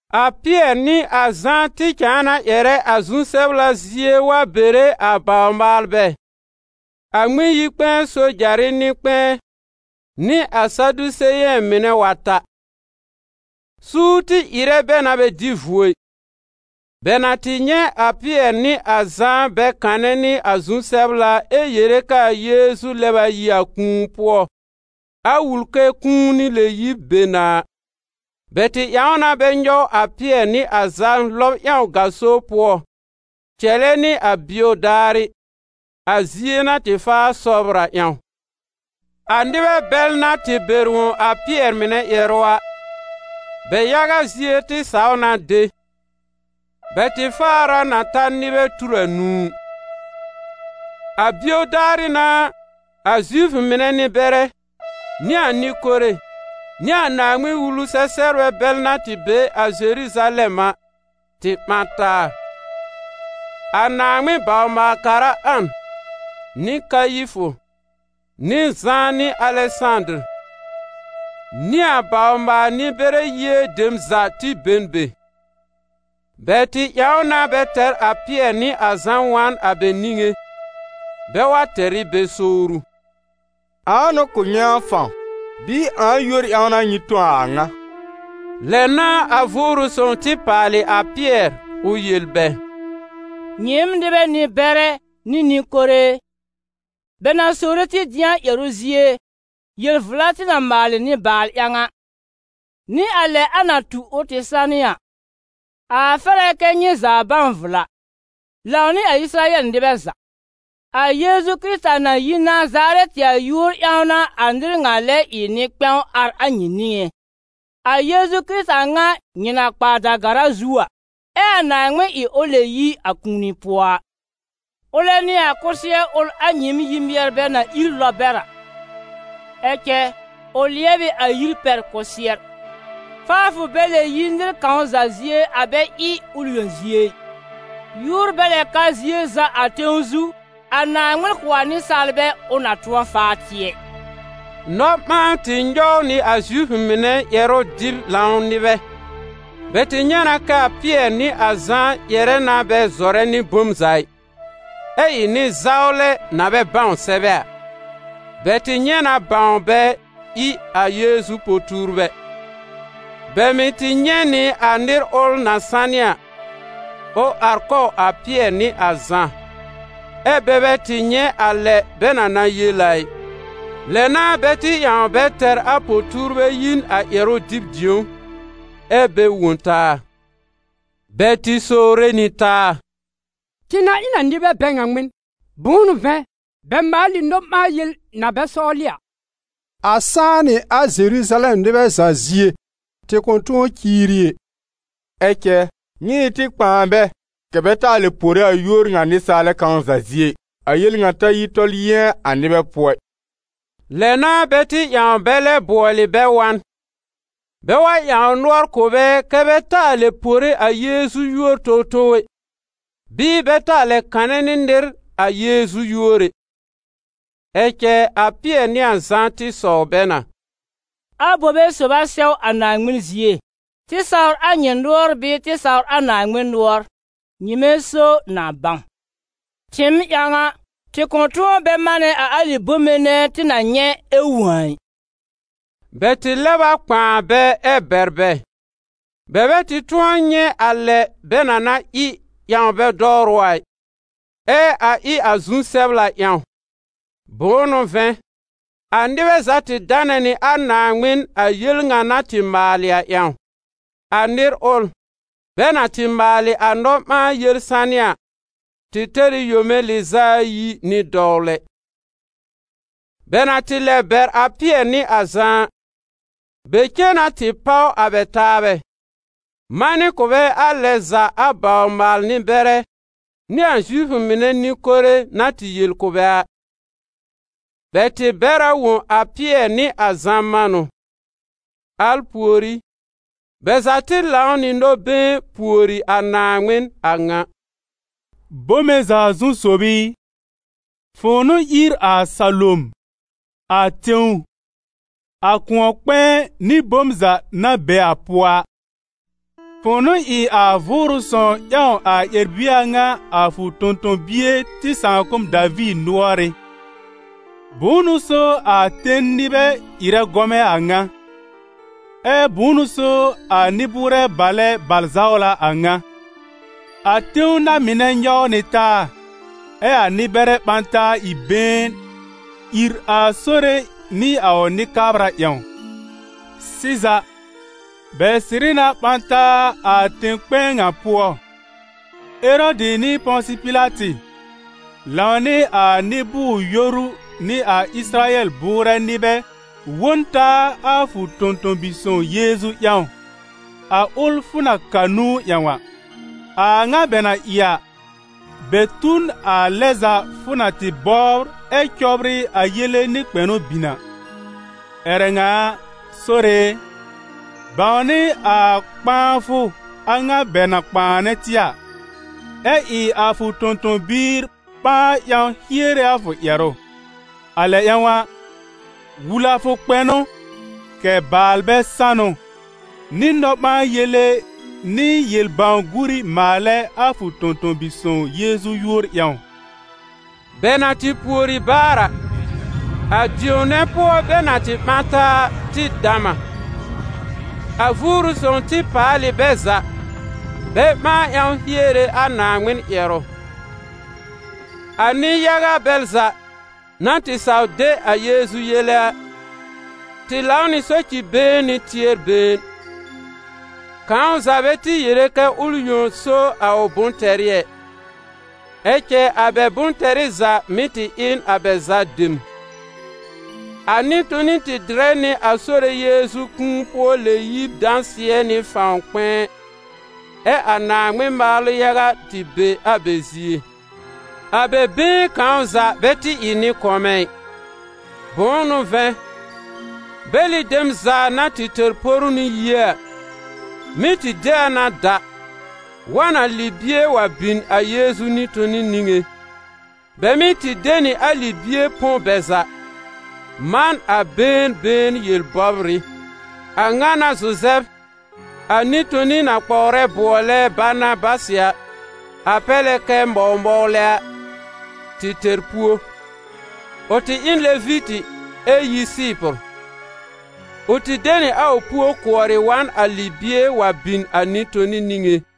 A Pɩɛr nɩ a Zã tɩ cãa na ƴɛrɛ a zu-sɛbla zie wa bere a bawr-maalbɛ, a Ŋmɩn-yi-kpɛ̃ɛ sojarɩ nɩ-kpɛ̃ɛ nɩ a Sadiseyɛ̃ mɩnɛ wa ta. Suur tɩ ɩrɛ bɛ na bɛ dɩ vuo ɩ, bɛ na tɩ nyɛ̃ a Pɩɛr nɩ a Zã bɛ kanɛ nɩ a zu-sɛbla ɛ yere k'aa Yeezu lɛb a yi a kũu pʋɔ, a wul k'aa kũuni lɛ-yib be na a. Bɛ tɩ ƴãw na bɛ nyɔw a Pɩɛr nɩ a Zã lɔb ƴãw gaso pʋɔ cɛlɛ nɩ a bio daarɩ, a zie na tɩ faa sɔbr a ƴãw. A nɩbɛ bɛl na tɩ bɛr wõ a Pɩɛr mɩnɛ ƴɛrʋ a, bɛ yaga zie tɩ saw na de. Bɛ tɩ faar a na ta nɩbɛ tur anũu. A bio daarɩ n'a, a Zifʋ mɩnɛ nɩ-bɛrɛ, nɩ a nɩ-kore nɩ a Naaŋmɩn-Wulu-sɛ-sɛbrbɛ bɛl na tɩ be a Zeruzalɛm a tɩ ɓã taa. A Naaŋmɩn bawr-maal-kara An, nɩ Kayifʋ, nɩ Zã nɩ Alɛsãdɩr, nɩ a bawr-maal-nɩ-bɛrɛ yie dem za tɩ be n be. Bɛ tɩ ƴãw na bɛ tɛr a Pɩɛr nɩ a Zã wa n a bɛ niŋé, bɛ wa tɛr ɩ bɛ sowru: «Ãa n'ʋ kʋ̀ nyɩ a fãw, bɩɩ ãa yúor ƴãw n'a nyɩ tõ a a ŋa?» Lɛ n'a a Vʋʋrʋ Sõw tɩ paalɩ a Pɩɛr ʋ yel bɛ: «Nyɩɩm, nɩbɛ nɩ-bɛrɛ nɩ nɩ-kore e, bɛ na sowre tɩ dɩ̃a, ƴɛrʋ zie, yel-vla tɩ na maalɩ nɩ-baal ƴãw a, nɩ a lɛ a na tu ʋ tɩ sanɩ a, a fɛr a kɛ nyɩ za bãw vla, lãw nɩ a Ɩsɩrayɛl nɩbɛ za: a Yeezu Kɩrɩta na yi Nazarɛtɩ a yúor ƴãw n'a a nɩr ŋa lɛ ɩ nɩ-kpɛ̃w ar a nyɩ niŋé, a Yeezu Kɩrɩta ŋa nyɩ na kpa a da-gara zu a, ɛ a Naaŋmɩn ɩ ʋ lɛb yi a kũuni pʋɔ a. Ʋlɛ n'ɩ ‹A kʋsɩɛr ʋl, a nyɩɩm yi-mɩɛrbɛ na ír lɔb bɛr a, ɛ cɛ ʋ lɩɛb ɩ a yir pɛr kʋsɩɛr.› Faafʋ bɛ lɛ yi nɩr kãw za zie a bɛ ɩ a ʋl yõ zie ɩ. Yúor bɛ lɛ ka zie za a tẽw zu, a Naaŋmɩn kʋ̀ a nɩsaalbɛ, ʋ na tʋ̃ɔ faa tɩ ɛ.» Nɔ-ɓãan tɩ nyɔw nɩ a Zifʋ mɩnɛ ƴɛrʋ-dɩb-lãw nɩbɛ. Bɛ tɩ nyɛ̃ na kɛ a Pɩɛr nɩ a Zã ƴɛrɛ na bɛ zɔrɛ nɩ bom za ɩ, ɛ ɩ nɩ-zawlɛ na bɛ bãw sɛbɛ a. Bɛ tɩ nyɛ̃ na bãw bɛ ɩ a Yeezu po-tuurbɛ. Bɛ mɩ̀ tɩ nyɛ̃ nɩ a nɩr ʋl na sanɩ a, ʋ ar kɔw a Pɩɛr nɩ a Zã, ɛ́ bɛ bɛ tɩ nyɛ̃ a lɛ bɛ na na yel a ɩ. Lɛ n'a bɛ tɩ ƴãw bɛ tɛr a po-tuurbɛ yi n a ƴɛrʋ dɩb dĩ̀ó, ɛ́ bɛ wõ taa. Bɛ tɩ sowre nɩ taa: «Tɩ na ɩ n a nɩbɛ bɛ ŋa ŋmɩn? Bʋ̃ʋ n'ʋ vɛ̃, bɛ maal ɩ nɔ-ɓãa-yel na bɛ sɔwlɩ a, a sãá nɩ a Zeruzalɛm nɩbɛ za zie, tɩ kʋ̃ tʋ̃ɔ ciiri ɛ. Ɛ cɛ, nyɩ ɩ tɩ kpãa bɛ kɛ̀ bɛ taa lɛ pore a yúor ŋa nɩsaalɛ kãw za zie ɩ, a yel ŋa ta yi tɔl yɩ̃ɛ a nɩbɛ pʋɔ ɩ.» Lɛ n'a bɛ tɩ ƴãw bɛ lɛ bʋɔlɩ bɛ wa n, bɛ wa ƴãw nʋɔr kʋ̀ bɛ kɛ́ bɛ taa lɛ pore a Yeezu yúor towtow ɛ, bɩɩ bɛ taa lɛ kanɛ nɩ nɩr a Yeezu yúor ɛ. Ɛ cɛ a Pɩɛr nɩ a Zã tɩ sɔw bɛ na: «Abobe sob a sɛw a Naaŋmɩn zie: tɩ sawr a nyɩ nʋɔr bɩɩ tɩ sawr a Naaŋmɩn nʋɔr? Nyɩmɛ so na bãw! Tɩɩm ƴãw a, tɩ kʋ̃ tʋ̃ɔ bɛ manɛ a alɩ bome nɛ tɩ na nyɛ̃ ɛ wõ a ɩ.» Bɛ tɩ lɛb a kpãa bɛ ɛ bɛr bɛ: bɛ bɛ tɩ tʋ̃ɔ nyɛ̃ a lɛ bɛ na na ɩ ƴãw bɛ dɔwrʋ a ɩ, ɛ a ɩ a zu-sɛbla ƴãw; bʋ̃ʋ n'ʋ vɛ̃, a nɩbɛ za tɩ danɛ nɩ a Naaŋmɩn a yel ŋa na tɩ maalɩ a ƴãw. A nɩr ʋl, bɛ na tɩ maalɩ a nɔ-ɓãa-yel sanɩ a, tɩ tɛr ɩ yome lɩz'a ayi nɩ dɔwlɛ. Bɛ na tɩ lɛb bɛr a Pɩɛr nɩ a Zã a, bɛ cen na tɩ páw a bɛ taabɛ, manɩ kʋ̀ bɛ a lɛ za a bawr-maal-nɩ-bɛrɛ nɩ a Zifʋ mɩnɛ nɩ-kore na tɩ yel kʋ̀ bɛ a. Bɛ tɩ bɛr a wõ a Pɩɛr nɩ a Zã manʋ. Al pùorí, bɛ za tɩ lãw nɩ nɔ-been pùori a Naaŋmɩn a ŋa: «Bome za zu sob i, fʋ̃ʋ n'ʋ ír a salom, a tẽw, a kʋ̃ɔ-kpɛ̃ɛ nɩ bom za na be a pʋɔ a. Fʋ̃ʋ n'ʋ ɩ a Vʋʋrʋ Sõw ƴãw a ƴɛr-bie a ŋa a fʋ tõ-tõ-bie tɩ sãakʋm Daviir nʋɔrɩ́: ‹Bʋ̃ʋ n'ʋ so a ten nɩbɛ ɩrɛ gɔmɛ a ŋa? Ɛ bʋ̃ʋ n'ʋ so a nɩ-bʋʋrɛ balɛ bal-zawlɛ a ŋa? A tẽw na-mɩnɛ nyɔw nɩ taa, ɛ a nɩ-bɛrɛ ɓã taa ɩ been, ìr a Sore nɩ a ʋ Nɩ-kabra ƴãw.›» «Sɩza, bɛ sɩrɩ na ɓã taa a tẽ-kpɛ̃ɛ ŋa pʋɔ: Erɔdɩ nɩ Pɔ̃sɩ Pɩlatɩ, lãw nɩ a nɩ-bʋʋr-yoru nɩ a Ɩsɩrayɛl bʋʋrɛ nɩbɛ wõ n taa a fʋ tõ-tõ-bi-sõw Yeezu ƴãw, a ʋl fʋ na ka nũu ƴãw a. A a ŋa bɛ na ɩ a, bɛ tu n a lɛ za fʋ na tɩ bɔbr ɛ cɔbrɩ a yele nɩ kpɛnʋ bin a. Ƴɛrɛ ŋa a, Sore e, bãwnɩ a kpãafʋ a ŋa bɛ na kpãanɛ tɩ a, ɛ ɩ a fʋ tõ-tõ-biir ɓãa ƴãw hiere a fʋ ƴɛrʋ. A lɛ ƴãw a, wul a fʋ kpɛnʋ, kɛ̀ baalbɛ sanʋ, nɩ nɔ-ɓãa-yele nɩ yel-bãw-guuri maalɛ a fʋ tõ-tõ-bi-sõw Yeezu yúor ƴãw.» Bɛ na tɩ pùori baar a, a dĩ̀ó nɛ pʋɔ bɛ na tɩ ɓã taa a, tɩ dam a: a Vʋʋrʋ Sõw tɩ paal ɩ bɛ za, bɛ ɓãa ƴãw hiere a Naaŋmɩn ƴɛrʋ. A nɩ-yaga bɛl za, na tɩ saw de a Yeezu yele a, tɩ lãw nɩ soci-been nɩ tɩɛr-been. Kãw za bɛ tɩ yere kɛ ʋl yõ so a ʋ bʋ̃-tɛrɩ ɛ, ɛ cɛ a bɛ bʋ̃-tɛrɩ za mɩ́ tɩ ɩ n a bɛ za dem. A nɩ-toni tɩ dɩrɛ nɩ a Sore Yeezu kũu-pʋɔ-lɛ-yib dãsɩɛ nɩ fãw kpɛ̃ɛ, ɛ a Naaŋmɩn maalʋ yaga tɩ be a bɛ zie. A bɛ been kãw za bɛ tɩ ɩ nɩ-kɔmɛ ɩ, bʋ̃ʋ n'ʋ vɛ̃, bɛlɩ dem za na tɩ tɛr poru nɩ yie a, mɩ́ tɩ de a na da, wa n a libie wa bin a Yeezu nɩ-toni niŋé. Bɛ mɩ́ tɩ de nɩ a libie põ bɛ za, man a been been yel-bɔbrɩ. A ŋa n'a Zuzɛb, a nɩ-toni na kpɔwrɛ bʋɔlɛ Banabasɩ, a pɛr lɛ kɛ Mɔw-mɔwlɛ a, tɩ tɛr puó. Ʋ tɩ ɩ n Levitɩ ɛ yi Sɩɩpʋr. Ʋ tɩ de nɩ a ʋ puó kʋɔrɩ wa n a libie wa bin a nɩ-toni niŋé.